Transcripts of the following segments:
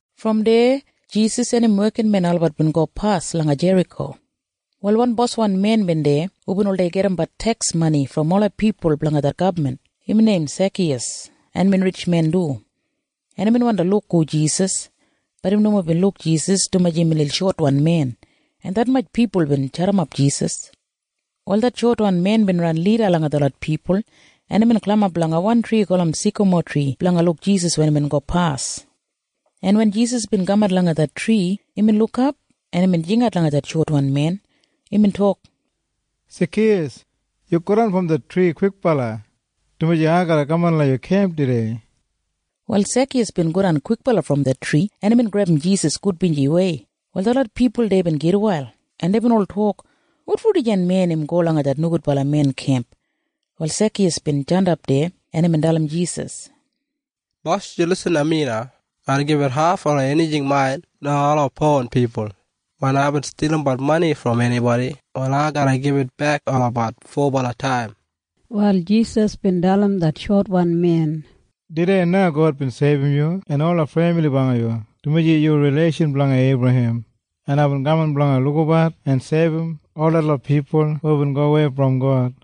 Brom deya Jisas en im wekinmen olabat bin gopas langa Jeriko. Wal wan boswan men bin deya hubin oldei gajimbat teks mani brom ola pipul blanga det gabman. Imbin neim Sekiyas, en imbin ritjmen du, en imbin wandi luk hu Jisas. Bat im nomo bin luk Jisas dumaji imbin lil shotwan men, en detmatj pipul bin jadimap Jisas. Wal det shotwan men bin ran lida langa detlot pipul, en imbin galimap langa wan tri gulum sikamotri blanga luk Jisas wen im gopas, en wen Jisas bin kamat langa det tri, imbin lukap en imbin jingat langa det shotwan men. Imbin tok, “Sekiyas! Yu godan brom det tri kwikbala, dumaji ai garra kaman langa yu kemp tudei.” Wal Sekiyas bin godan kwikbala brom det tri, en imbin grebum Jisas gudbinjiwei. Wal detlot pipul deya bin gitwail, en deibin ol tok, “Wotfo dijan men im go langa det nogudbala men kemp?” Wal Sekiyas bin jandap deya, en imbin dalim Jisas, “Bos, yu irrim mi na. Ai garra gibit haf ola enijing main langa ola powan pipul, en wen aibin stilimbat mani brom enibodi, wal ai garra gibitbek olabat fobala taim.” Wal Jisas bin dalim det shotwan men, “Tudei na God bin seibum yu en ola femili blanga yu, dumaji yu rileishan blanga Eibrahem, en aibin kaman blanga lukabat en seibum ol detlot pipul hubin gowei brom God.”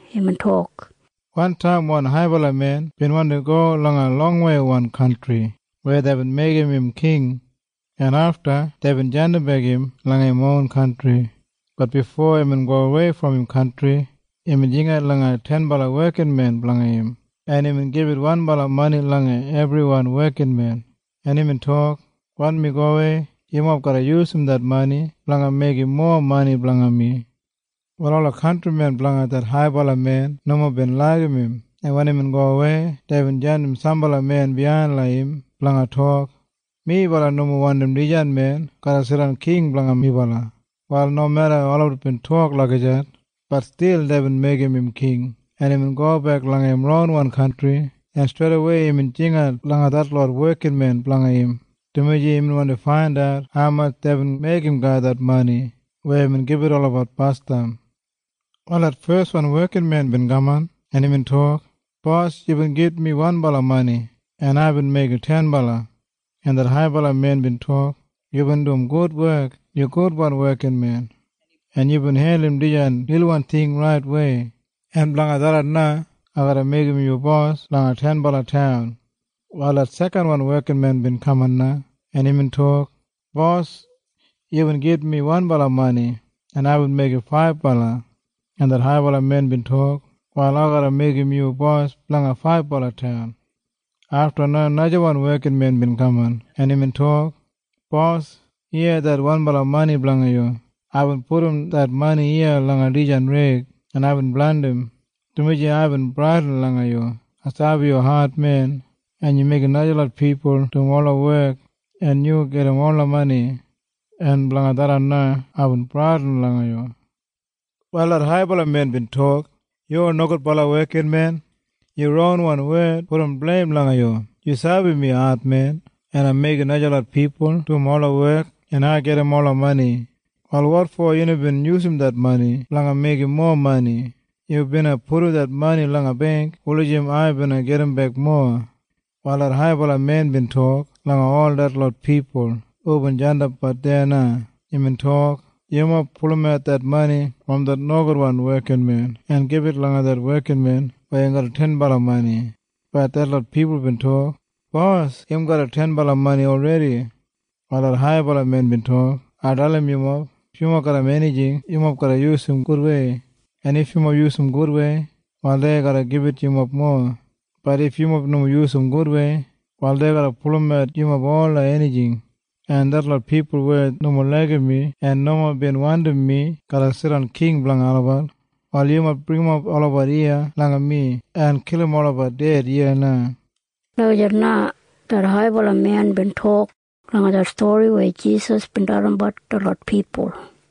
Imbin tok, “Wantaim wan haibala men bin wandi go langa longwei kantri weya deibin meigim im king, en afta deibin jandimbek im langa im ron kantri. Bat bifo imbin gowei brom im kantri imbin jingat langa tenbala wekinmen blanga im, en imbin gibit wanbala mani langa ebriwan wekinmen, en imbin tok, ‘Wen mi gowei, yumob garra yusum det mani blanga meigim mowa mani blanga mi.’ “Wal ola kantrimen blanga det haibala men nomo bin laigim im, en wen imbin gowei, deibin jandim sambala men biyain langa im blanga tok, ‘Melabat nomo wandim dijan men garra jidan king blanga melabat.’ “Wal nomeda olabat bin tok lagijat, bat stil deibin meigim im king, en imbin gobek langa im ronwan kantri, en streidawei imbin jingat langa detlot wekinmen blanga im, dumaji imbin wandi faindat haumatj deibin meigim garram det mani weya imbin gibit olabat basdam. “Wal det feswan wekinmen bin kaman, en imbin tok, ‘Bos, yubin gibit mi wanbala mani, en aibin meigim tenbala.’ “En det haibala men bin tok, ‘Yubin dum gud wek. Yu gudwan wekinmen, en yubin hendulum dijan lilwan ting raitwei, en blanga tharran na ai garra meigim yu bos blanga tenbala taun.’ “Wal det sekanwan wekinmen bin kaman na, en imbin tok, ‘Bos, yubin gibit mi wanbala mani, en aibin meigim faibala.’ “En det haibala men bin tok, ‘Wal ai garra meigim yu bos blanga faibala taun.’ “Afta na najawan wekinmen bin kaman, en imbin tok, ‘Bos, iya det wanbala mani blanga yu. Aibin pudum det mani iya langa dijan reig, en aibin blandim, dumaji aibin bradin langa yu. Ai sabi yu admen en yu meigim najalot pipul dum ola wek en yu gajim ola mani. En blanga tharran na aibin bradin langa yu.’ “Wal det haibala men bin tok, ‘Yu nogudbala wekinmen. Yu ronwan wed pudum bleim langa yu. Yu sabi mi admen en ai meigim najalot pipul dum ola wek en ai gajim ola mani. Wal wotfo yu nomo bin yusum det mani blanga meigim mowa mani? Yu bina pudum det mani langa beingk wulijim ai bina gajimbek mowa.’ “Wal det haibala men bin tok langa ol detlot pipul hubin jandapbat deya na. Imbin tok, ‘Yumob pulumat det mani brom det nogudwan wekinmen en gibit langa det wekinmen weya garram tenbala mani.’ “Bat detlot pipul bin tok, ‘Bos, im garram tenbala mani olredi!’ “Wal det haibala men bin tok, ‘Ai dalim yumob. If yumob garram enijing, yumob garra yusum gudwei. En if yumob yusum gudwei, wal dei garra gibit yumob mowa. Bat if yumob nomo yusum gudwei, wal dei garra pulumat yumob ola enijing. En detlot pipul weya nomo laigim mi en nomo bin wandim mi garra jidan king blanga olabat, wal yumob bringimap olabat iya langa mi en kilim olabat ded iya na.’” Lagijat na det haibala men bin tok langa det stori weya Jisas bin dalimbat detlot pipul.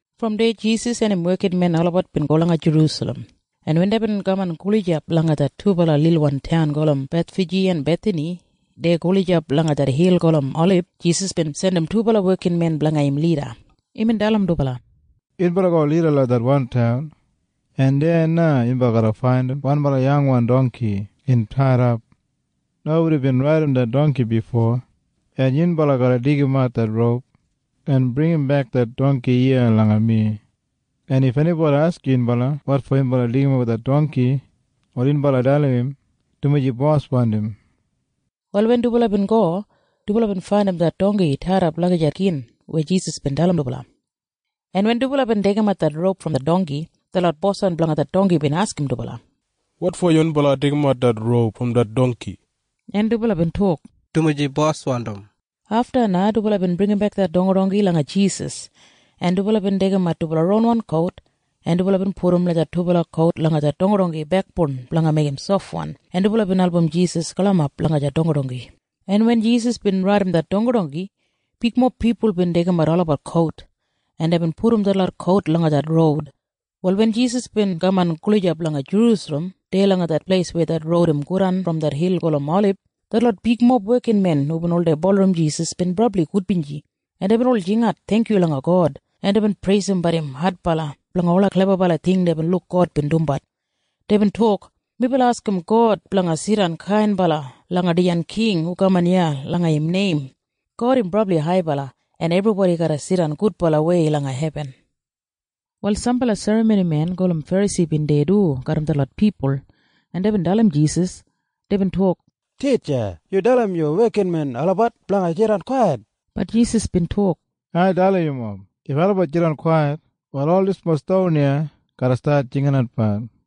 Brom deya Jisas en im wekinmen olabat bin go langa Jerusalem, en wen deibin kaman gulijap langa det dubala lilwan taun gulum Bethfaji en Bethani deya gulijap langa det hil gulum Olib, Jisas bin jandim dubala wekinmen blanga im lida. Imbin dalim dubala, “Yunbala go lida langa det wan taun, en deya na yunbala garra faindim wanbala yangwan dongki im taidap. Nobodi bin raidim det dongki bifo. En yunbala garra deigimat det roup en bringimbek det dongki iya langa mi. En if enibodi askim yunbala wotfo yunbala deigimat det dongki, wal yunbala dalim im, ‘Dumaji bos wandim.’” Wal wen dubala bin go, dubala bin faindim det dongki taidap lagijat gin weya Jisas bin dalim dubala, en wen dubala bin deigimat det roup brom det dongki, detlot boswan blanga det dongki bin askim dubala, “Wotfo yunbala deigimat det roup brom det dongki?” En dubala bin tok, “Dumaji bos wandim.” Afta na dubala bin bringimbek det dongki langa Jisas, en dubala bin deigimat dubala ronwan kout, en dubala bin pudum det dubala kout langa det dongki bekboun blanga meigim sofwan, en dubala bin album Jisas galimap langa det dongki, en wen Jisas bin raidim det dongki, bigmob pipul bin deigimat olabat kout, en deibin pudum detlot kout langa det roud. Wal wen Jisas bin kaman gulijap langa Jerusalem deya langa det pleis weya det roud im godan brom det hil gulum Olib, detlot bigmob wekinmen hubin oldei bulurrum Jisas bin brabli gudbinji, en deibin ol jingat theingkyu langa God, en deibin preisimbat im adbala blanga ola klebabala ting deibin luk God bin dumbat. Deibin tok, “Melabat askim God blanga jidan kainbala langa dijan king hu kaman langa im neim. God im brabli haibala, en ebribodi garra jidan gudbalawei langa hebin.” Wal sambala serramonimen gulum Ferasi bin deya du garram detlot pipul, en deibin dalim Jisas. Deibin tok, “Titja, yu dalim yu wekinmen olabat blanga jidan kwait.” Bat Jisas bin tok, “Ai dalim yumob. If olabat jidan kwait, wal ol dislot ston iya garra stat jinginatbat.”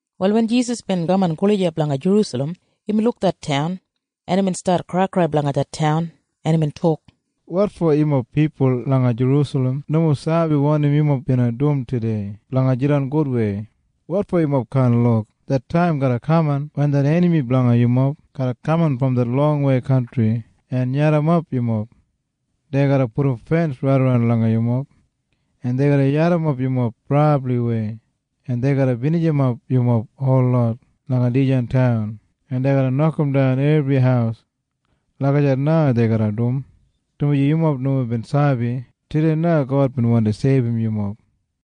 Wal wen Jisas bin kaman gulijap langa Jerusalem, imbin luk det taun, en imbin stat kraikrai blanga det taun, en imbin tok, “Wotfo yumob pipul langa Jerusalem nomo sabi wanim yumob bina dum tudei blanga jidan gudwei? Wotfo yumob kaan luk? Det taim garra kaman wen det enami blanga yumob garra kaman brom det longwei kantri en yadimap yumob. Dei garra pudum fens raidaran langa yumob, en dei garra yadimap yumob brabliwei, en dei garra binijimap yumob holot langa dijan taun, en dei garra nokamdan ebri haus. Lagijat na dei garra dum, dumaji yumob nomo bin sabi tudei na God bin wandi seibum yumob!”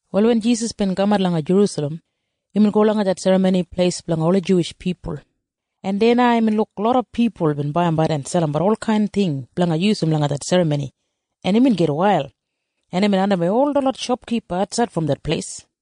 Wal wen Jisas bin kamat langa Jerusalem, imbin go langa det Serramoni Pleis blanga ola Juwish pipul, en deya na imbin luk loda pipul bin baiyimbat en selimbat olkain ting blanga yusum langa det serramoni, en imbin gitwail, en imbin andimwei ol detlot shopkipa atsaid brom det pleis,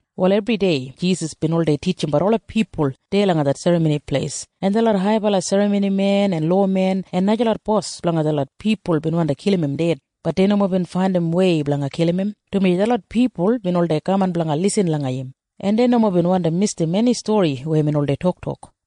Wal ebridei Jisas bin oldei titjimbat ola pipul deya langa det Serramoni Pleis. En detlot haibala serramoni en lowamen en najalot bos blanga detlot pipul bin wandi kilim im ded. Bat dei nomo bin faindim wei blanga kilim im, dumaji detlot pipul bin oldei kaman blanga lisin langa im, en dei nomo bin wandi misdim eni stori weya imbin oldei tok.